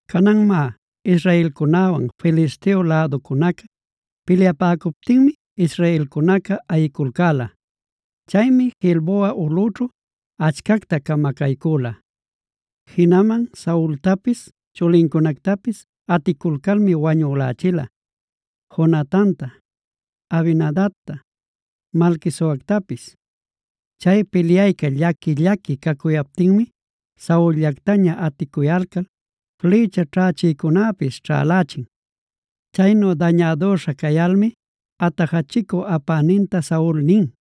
Canan má, israelcunäwan Filisteo läducunaca pilyapäcuptinmi israelcunaca ayiculcäla. Chaymi Gilboa ulꞌućhu achcacta camacaycüla. Jinaman Saultapis chulincunactapis aticulcalmi wañülächila: Jonatanta, Abinadabta, Malquisuactapis. Chay pilyayca llaqui-llaqui cacuyaptimi Saul-llactaña aticuyalcal flïcha ćhächïcunäpis ćhälächin. Chaynu dañädüśha cayalmi atajachicu apäninta Saul nin: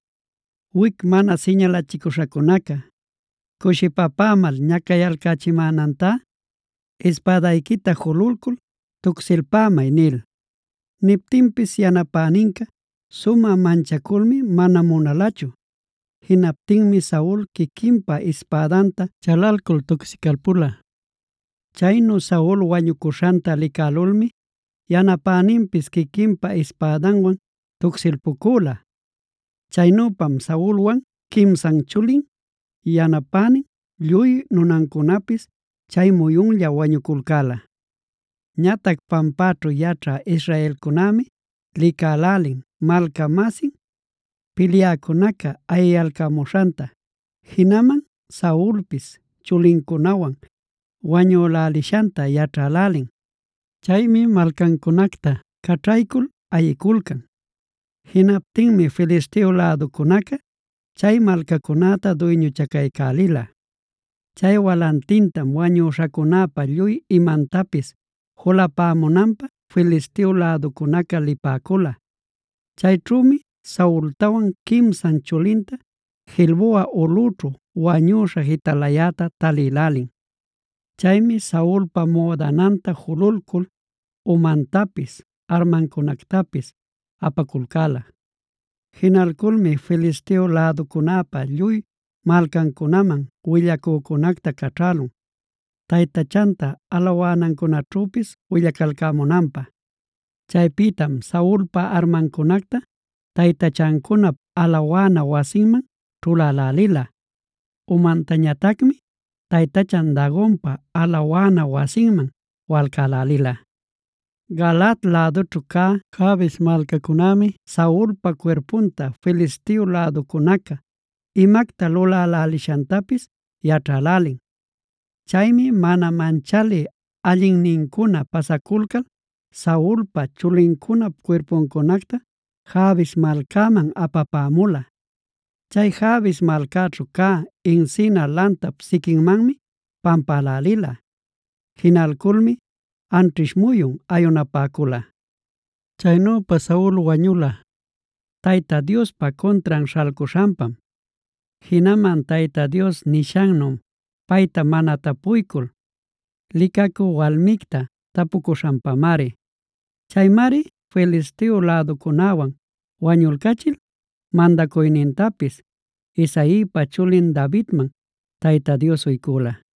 “Wic mana siñalachicüśhacunacaa cushipapämal ñacayalcächimänantá ispädayquita jululcul tucsilpämay” nil. Niptinpis yanapäninca sumä manchaculmi mana munalachu. Jinaptinmi Saul quiquinpa ispädanta chalalcul tucsicalpula. Chaynu Saul wañucuśhanta licälulmi yanapäninpis quiquinpa ispädanwan tucsilpucüla. Chaynüpam Saulwan quimsan chulin, yanapänin, lluy nunancunapis chay muyunlla wañuculcäla. Ñatac pampaćhu yaćhä israelcunämi licälälin malca-masin pilyäcunaca ayiyalcämuśhanta, jinaman Saulpis chulincunawan wañülälishanta yaćhälälin. Chaymi malcancunacta caćhaycul ayiculcan. Jinaptinmi Filisteo läducunaca chay malcacunäta duyñuchacaycälila. Chay walantintam wañüśhacunäpa lluy imantapis julapämunanpä Filisteo läducunaca lipäcula. Chayćhümi Saultawan quimsan chulinta Gilboa ulꞌućhu wañüśha jitalayäta talïlälin. Chaymi Saulpa müdananta jululcul umantapis armancunactapis apaculcäla. Jinalculmi Filisteo läducunäpa lluy malcancunaman willacücunacta caćhälun taytachanta alawanancunäćhüpis willacalcämunanpä. Chaypïtam Saulpa armancunacta taytachancunap alawana wasinman ćhulälälila. Umantañatacmi taytachan Dagonpa alawana wasinman walcälälila. Galaad lädućhu cä Jabes malcayücunämi Saulpa cuirpunta Filisteo läducunaca imacta lulälälishantapis yaćhälälin. Chaymi mana manchalï allinnincuna pasaculcal Saulpa, chulincunap cuirpuncunacta Jabes malcaman apapämula. Chay Jabes malcaćhu cä encina lantap siquinmanmi pampälälila. Jinalculmi anćhish muyun ayunapäcula. Chaynüpa Saul wañula, Tayta Diospa cuntran śhalcuśhanpam, jinaman Tayta Dios nishannu payta mana tapuycul, licacü walmicta tapucuśhanpamari.b Chaymari Filisteo läducunäwan wañulcachil mandacuynintapis Isaipa chulin Davidman Tayta Dios uycula.c